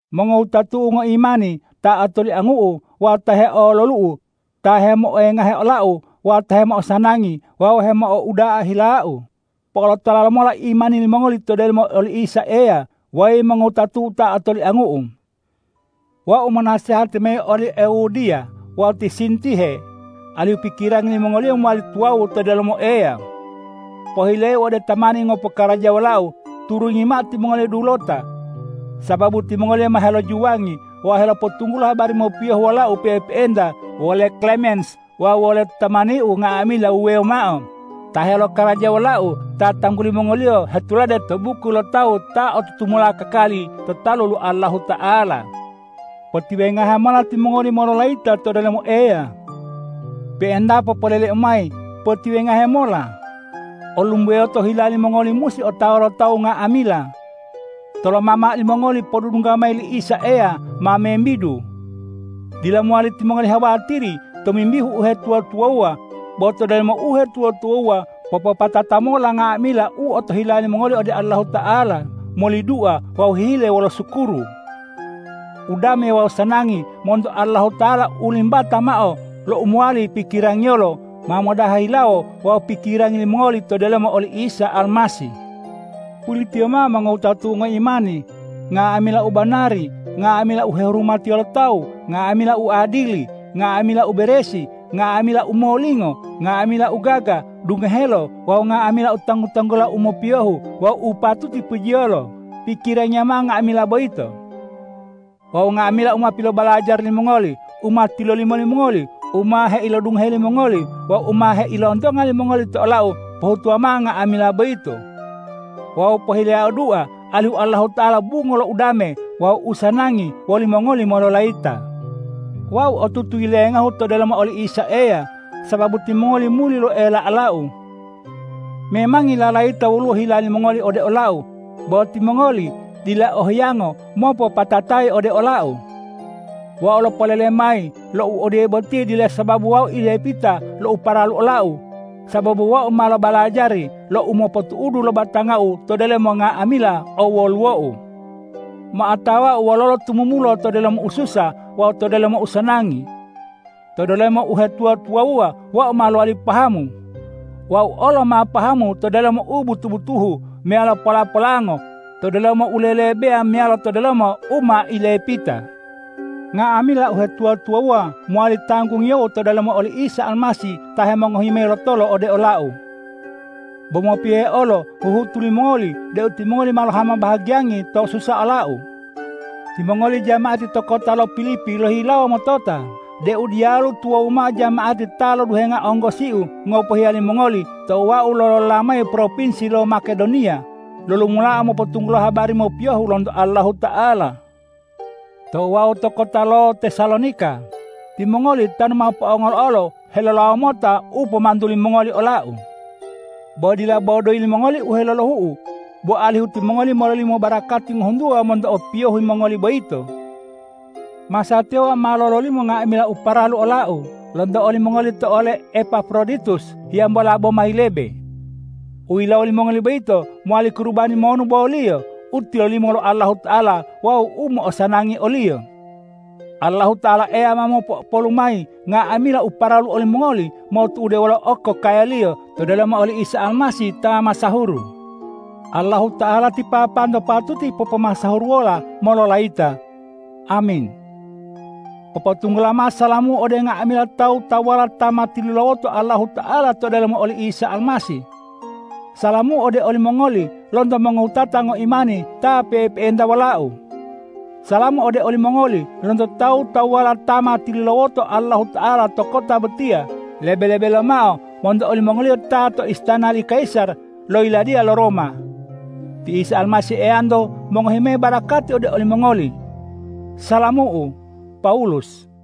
Mongowutatu'u ngoimani ta otoliangu'u wawu ta heololu'u, ta hemoengahe olau wawu ta hemo'osanangi wawu hemo'ouda'a hilau, po'olotola lomola imani limongoli to delomo oli Isa Eya, weyi mongowutatu'u ta otoliangu'u. Wau monasehati mayi oli Euodiya wawu ti Sintihe alihu pikirangi limongoliyo mowali tuwawu to delomo Eya. Pohileu ode tamani ngopokarajawa wolau, turungi mao timongoliyo dulota. Sababu timongoliyo ma helojuwangi wawu helopotunggulo habari mopiyohu wolau pe'epe'enta wole Klemens wawu wolo tamaniu nga'amila wuwewo mao ta helokaraja wolau ta tangguli mongoliyo hetulade to buku lo tawu ta o tutumula kakali to talu lo Allahuta'ala. Potiwengahe mola timongoli mololayita to delomo Eya! Pe'entapo poleleu mayi: Potiwengahe mola! Olumboyoto hila limongoli musi otawa lo tawu nga'amila. Toloma mao limongoli podudungga mayi li Isa Eya ma membidu! Dila mowali timongoli hawatiri tomimbihu uhetuwa-tuwawuwa, bo to delomo uhetuwa-tuwawuwa popopatata mola nga'amila u otohila limongoli ode Allahuta'ala moli dua wawu hihile wolo sukuru. Udame wawu usanangi monto Allahuta'ala u limbata mao lo u mowali pikirangiyolo ma modaha hilawo wawu pikirangi limongoli to delomo oli Isa Almasih. Pulitiyo mao mongowutatu'u ngoimani, nga'amila u banari, nga'amila u hehurumatiyo lo tawu, nga'amila u adili, nga'amila u beresi, nga'amila u molingo, nga'amila u gaga dungohelo wawu nga'amila u tanggu-tanggula u mopiyohu wawu u patuti pujiyolo, pikirangiya mao nga'amila boyito. Wawu nga'amila u ma pilobalajari limongoli, u ma tilolimo limongoli, u ma heilodungohe limongoli wawu u ma heilontonga limongoli to olau, pohutuwa mao nga'amila boyito. Wawu pohileyau dua alihu Allahuta'ala bungo lo udame wawu usanangi wolimongoli mololayita. Wau otutu yilengahu to delomo oli Isa Eya, sababu timongoli muli lo'oela olau. Memangi lalayita woluwo hila limongoli ode olau, bo timongoli dila o hiyango mopopatatayi ode olau. Wau lopolele mayi lo u odiye boti dila sababu wau ilepita lo u paralu olau, sababu wau ma lobalajari lo umopotu'udu lo batangau to delomo nga'amila owoluwou. Ma otawau wololo tumumula to delomo ususa wawu to delomo usanangi. To delomo uhetuwa-tuwawuwa wau ma lowali pahamu. Wau olo ma pahamu to delomo u butu-butuhu meyalo pola-polango, to delomo u lelebeya meyalo to delomo u ma ilepita. Nga'amila uhetuwa-tuwawuwa mowali tanggungiyou to delomo oli Isa Almasih ta hemongohi mayi lotolo ode olau. Bo mopiyohe olo huhutu limongoli deu timongoli ma lohama bahagiyangi tou susa olau. Timongoli jama'ati to kota lo Pilipi lohihilawo motota deu diyalu tuwawu mao jama'ati ta loduhenga onggosiu ngopohiya limongoli tou wau lolola mayi propinsi lo Makedoniya, lolumula mopotunggulo habari mopiyohu lonto Allahuta'ala. Tou wau to kota lo Tesalonika, timongoli tanu ma po'ongolo olo helolawo mota u pomantu limongoli olau. Bo dila bo doyi limongoli u helolohu'u, bo alihu timongoli mololimo barakati ngohuntuwa monto opiyohi mongoli boyito. Masatiya wau ma lololimo nga'amila u paralu olau lonto olimongoli to ole Epafroditus hiyambola boma yilebe. U yilawo limongoli boyito mowali kurubani monu boliyo, u tolimo lo Allahuta'ala wawu u mo'osanangi o-Liyo. Allahuta'ala Eyau ma mopo'opolu mayi nga'amila u paralu olimongoli motu'ude wolo okokaya-Liyo to delomo oli Isa Almasih ta masahuru. Allahuta'ala ti Papanto patuti popomasahuruwola mololayita! Amin. Popotunggula mao salamu'u ode nga'amila tawu-tawuwala ta ma tilulawoto Allahuta'ala to delomo oli Isa Almasih. Salamu ode olimongoli lonto mongowutata ngoimani ta pe'epe'enta wolau. Salamu ode olimongoli lonto tawu-tawuwala ta ma tilulawoto Allahuta'ala to kota botiya, lebe-lebe lomao monto olimongoliyo ta to istana li kayisar lo yiladiya lo Roma. Ti Isa Almasih Eyanto mongohi mayi barakati ode olimongoli. Salamu'u, Pawulus